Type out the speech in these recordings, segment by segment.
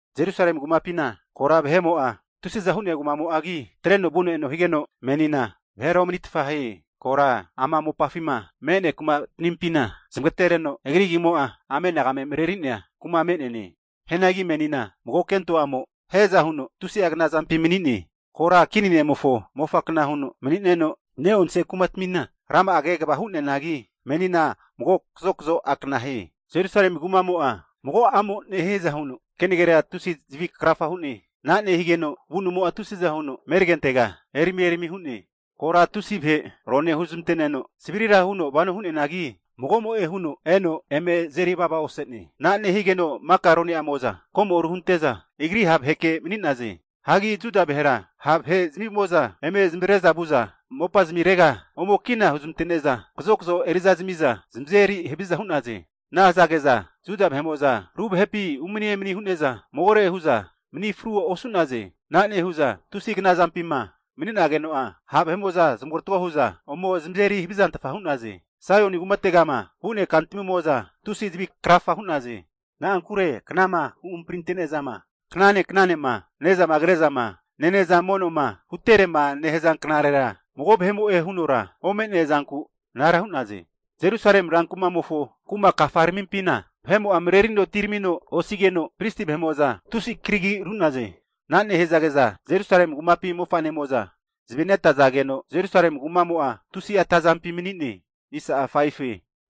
Jerusalemi kumapina kora vahe'mo'a tusiza hu'nea kumamo'agi, atreno vuno eno higeno, menina vahera omanitfa hie. Kora ama mopafima me'nea kumatmimpina zmagatereno agri agimo'a anagame mareneria kuma me'neane. Hianagi menina mago kento a'mo hiaza huno tusi'a knazampi mani'ne. Kora kini ne'mofo mofa kna huno mani'neno, ne'onse kumatmina rama'a kegava hu'neanagi, menina mago kazokazo akna hie. Jerusalemi kumamo'a mago a'mo nehiaza huno kenagera tusi zavikrafa hu'ne. Ana nehigeno avunumo'a tusiza huno ameregentega erami erami hu'ne. Kora tusi vahe ronea huzmante'neno savrira huno vano hu'neanagi, magomo'e huno eno eme azeri vavaose'ne. Ana nehigeno maka rone'amo'za komoru hunte'za, agri ha' vaheke mani'naze. Hagi Juda vahera ha' vahezmimo'za eme zamavare'za vu'za mopazmirega ome kina huzmante'neza, kazokazo eri'za zamiza zamazeri haviza hu'naze. Ana hazage'za Juda vahe'mo'za ru vahepi umani emani hu'neza, magore hu'za mani fru osu'naze. Ana nehu'za tusi knazampima mani'nageno'a, ha' vahe'mo'za zamarotago hu'za ome zamazeri havizantfa hu'naze. Hagi Saioni kumategama vu'nea kantamimo'za tusi zavi krafa hu'naze. Na'ankure knama huhamparinte'nezama knane knanema ne'zama kre'zama nene'za mono'ma huterema nehaza knarera mago vahe'mo'e hunora ome'nea zanku anara hu'naze. Jerusalemi ran kumamofo kuma kafaramimpina vahe'mo'a marerino atiramino osigeno, pristi vahe'mo'za tusi karagi ru'naze. Ana nehazage'za Jerusalemi kumapi mofa'nemo'za zavi netazageno, Jerusalemi kumamo'a tusi'a atazampi mani'ne.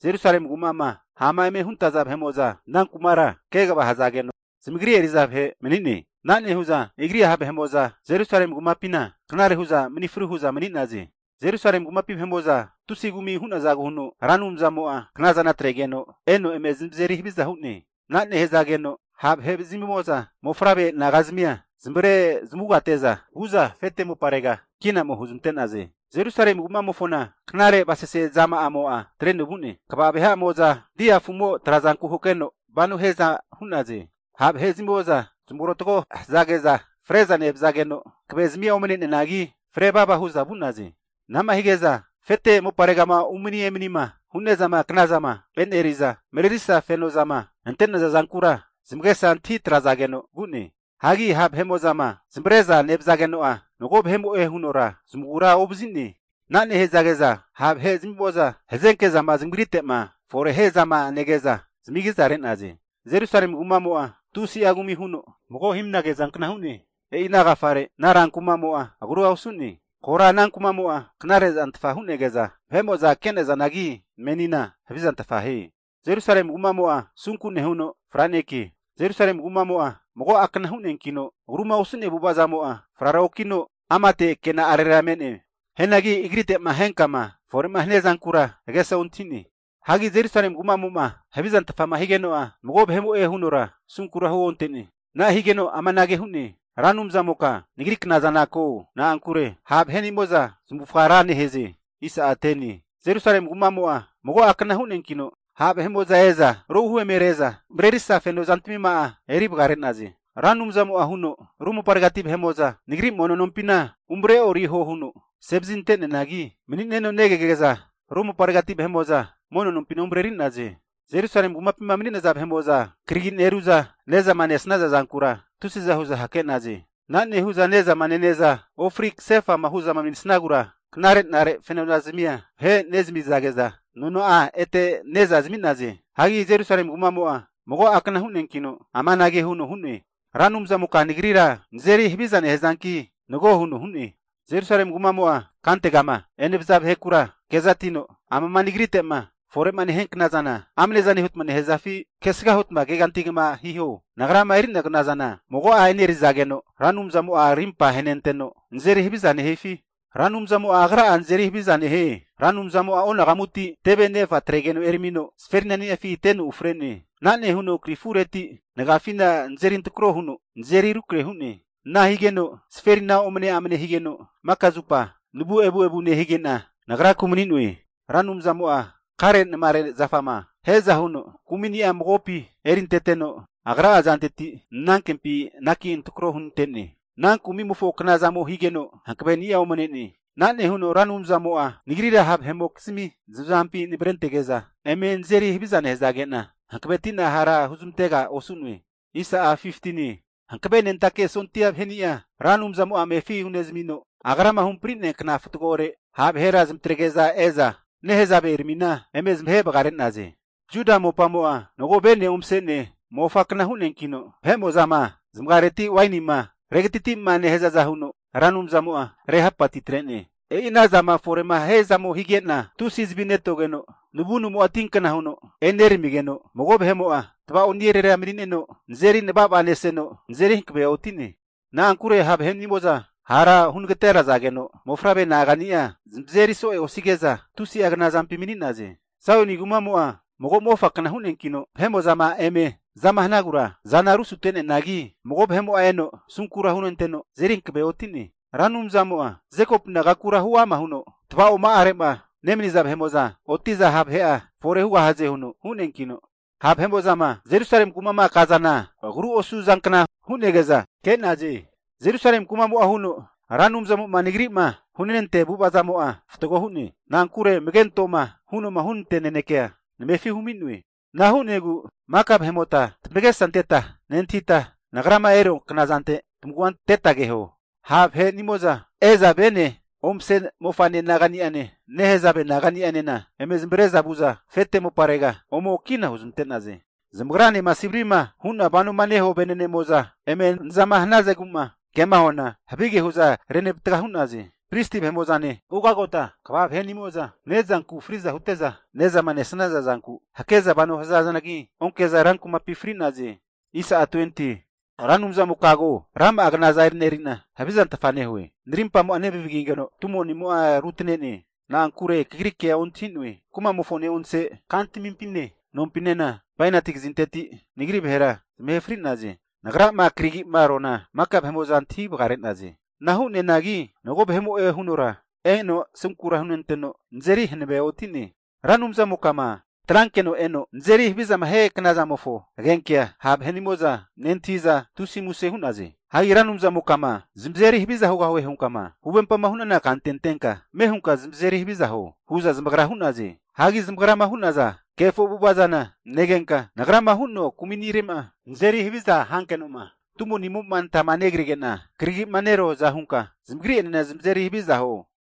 Jerusalemi kuma'ma ha'ma eme huntaza vahe'mo'za ana kumara kegava hazageno zamagri eri'za vahe mani'ne. Ana nehu'za agri ha' vahe'mo'za Jerusalemi kumapina knare hu'za mani fru hu'za mani'naze. Jerusalemi kumapi vahe'mo'za tusi kumi hu'nazagu huno, Ra Anumzamo'a knazana atregeno eno eme zamazeri haviza hu'ne. Ana hazageno ha' vahezmimo'za mofavre nagazmia zamavare zamavugate'za vu'za afete moparega kina ome huzmante'naze. Jerusalemi kumamofona knare avasase zama'amo'a atreno vu'ne. Kva vahe'amo'za dia afu'mo trazanku hakeno vano hiaza hu'naze. Ha' vahe'zamimo'za zamarotgo hazage'za fre'za nevazageno hankave zamia omane'neanagi, fre vava hu'za vu'naze. Anama hige'za afete moparegama umani emanima hu'nezama knazama eneri'za, marerisa fenozama ante'naza zankura zamagesa antahi atrazageno vu'ne. Hagi ha' vahe'mo'zama zamavare'zama nevazageno'a, mago vahemo'e hunora zamagura ovazi'ne. Ana nehazage'za ha' vahezmimo'za hazenke zama zamagrite'ma fore hiazama nege'za zamagizare'naze. Jerusalemi kumamo'a tusi'a kumi huno mago himnage zankna hu'ne. E'ina agafare ana rankumo'a agrua osu'ne. Kora ana kumamo'a knare zantfa hunege'za vahe'mo'za kenazanagi, menina havizantfa hie. Jerusalemi kumamo'a asunku nehuno franekie. Jerusalemi kumamo'a mago akana hu'neankino, agru'ma osu'nea avu'avazamo'a frara okino amate kena'arera me'ne. Hianagi agrite'ma henkama fore'ma hania zankura agesa ontahi'ne. Hagi Jerusalemi kumamo'ma havizantfama higeno'a, mago vahemo'e hunora asunkura huonte'ne. Ana higeno amanage huno hu'ne. Ra Anumzamoka nagri knazana ko. Na'ankure ha' vahenimo'za zmavufga ra nehaze. Jerusalemi kumamo'a mago akna hu'neankino, ha' vahe'mo'za eza rohu emere'za marerisa feno zantamima'a eri vagare'naze. Ra Anumzamo'a huno, ru moparegati vahe'mo'za Nagri Mono nompina umareoriho huno asevazi zmante'neanagi mani'neno negege'za ru moparegati vahe'mo'za Mono nompina umareri'naze. Jerusalemi kumapima mani'naza vahe'mo'za karagi neru'za ne'zama nesaza zankura tusiza hu'za hake'naze. Ana nehu'za ne'zama nene'za ofri kasefa'ma hu'za manisnagura, knare'nare feno zazamia vahe nezami'zage'za, nona'a ete ne'za zami'naze. Hagi Jerusalemi kumamo'a mago akna hu'neankino amanage huno hu'ne. Ra Anumzamoka nagrira nazeri haviza nehazanki, nago huno hu'ne. Jerusalemi kumamo'a kantegama enevaza vahekura kezatino, amama nagrite'ma fore'ma nehia knazana amnezane huta nehazafi? Kesga huta keganti kegama hiho, nagrama enerua knazana mago'a enerizageno, Ra Anumzamo'a arimpa ahenanteno nazeri haviza nehifi? Ra Anumzamo Agra'a nazeri havizana nehie. Ra Anumzamo'a onagamuti teve nefa atregeno eramino zaferinani'afi teno ufre'ne. Ana nehuno krifureti nagiafina nazeri antrako huno nazeri rukrahe hu'ne. Ana higeno zaferina omneamne higeno, maka zupa navu evuevu nehige'na nagraku mani'noe. Ra Anumzamo'a karenamare zafama hiaza huno kumini'a magopi erinteteno Agra'a azanteti nanankempi anaki antrako hunte'ne. Ana kumimofo knazamo higeno hankaveni'a omne'ne. Ana nehuno Ra Anumzamo'a nagrira ha' vahe'nimokizmi zamazampi navre antege'za, eme nazeri haviza nehazage'na hankaveti'na hara huzmantega osu'noe. Hankavenentake sondia vaheni'a Ra Anumzamo'a amefi hunezamino, Agrama huhampri'nea kna fatgore ha' vahera zamatrege'za e'za nehazaveramina eme zamahe vagare'naze. Juda mopamo'a mago vene omase'nea mofakna hu'neankino, vahe'mo'zama zamagareti wainima regatiti'ma nehazaza huno Ra Anumzamo'a rehapatitre'ne. E'inahu zama fore'ma hiazamo hige'na, tusi zavi netogeno navunumo'a tinkna huno eneramigeno, mago vahe'mo'a tavao'nirera mani'neno nazeri navavaneseno, nazeri hankavea oti'ne. Na'ankure ha' vahenimo'za hara hunagaterazageno, mofavre nagani'a zamazeri so'ea osige'za tusi'a knazampi mani'naze. Saioni kumamo'a mago mofakna hu'neankino, vahe'mo'zama eme azama hanagura azana rusute'neanagi, mago vahe'mo'a eno asunkura hunenteno azeri hankavea oti'ne. Ra Anumzamo'a Jekopu nagakura huama huno, Tavaoma'arema nemaniza vahe'mo'za oti'za ha' vahe'a fore hugahaze huno hu'neankino, ha' vahe'mo'zama Jerusalemi kuma'ma kazana, agru osu zankna hu'nege'za ke'naze. Jerusalemi kumamo'a huno, Ra Anumzamo'ma nagri'ma hunantea avu'avazamo'a fatgo hu'ne. Na'ankure amage antoma huno hunantea nanekea namefi humi'noe. Ana hu'negu maka vahe'mota tamagesa anteta nentahita, nagrama erua knazante tamavua anteta keho. Ha' vahenimo'za e'za vene omase mofane nagani'ane, nehazave naga'nianena eme zamavare'za vu'za, afete moparega ome kina huzmante'naze. Zamagranema savri'ma hu'na vanoma nehua venenemo'za eme naza hanazegu'ma kema huana, havige hu'za renavatga hu'naze. Pristi vahenimo'zane, ugagota kva vahenimo'za ne'zanku fri'za hute'za, ne'zama nesaza zanku hake'za vano hazanagi, onke'za ran kumapi fri'naze. Ra Anumzamoka ko, rama'a knaza e'neri'na havizantfa nehue. Narimpamo'a nevamagigeno, tumonimo'a rutane'ne. Na'ankure kagri kea ontahi'noe. Kumamofo ne'onse kantamimpine, nompinena bainati kazinteti nagri vahera zamahe fri'naze. Nagrama karagi'ma ruana maka vahe'mo'za antahi vagare'naze. Ana hu'neanagi mago vahemo'e hunora eno asunkura hunenanteno, nazeri hanavea oti'ne. Ra Anumzamoka'ma atrankeno eno nazeri havizama hia knazamofo agenkea ha' vahenimo'za nentahi'za, tusi muse hu'naze. Hagi Ra Anumzamoka'ma zamazeri haviza hugahue hunka'ma huvempama hu'nana kante antenka, ame hunka zamazeri haviza huo hu'za zamagra hu'naze. Hagi zamagrama hu'naza kefo avu'ava zana negenka, nagrama hu'noa kumi'nire'ma nazeri haviza hankenoma tumonimo'ma natama negrige'na karagi'ma ru'noaza hunka zamagri'enena zamazeri haviza huo.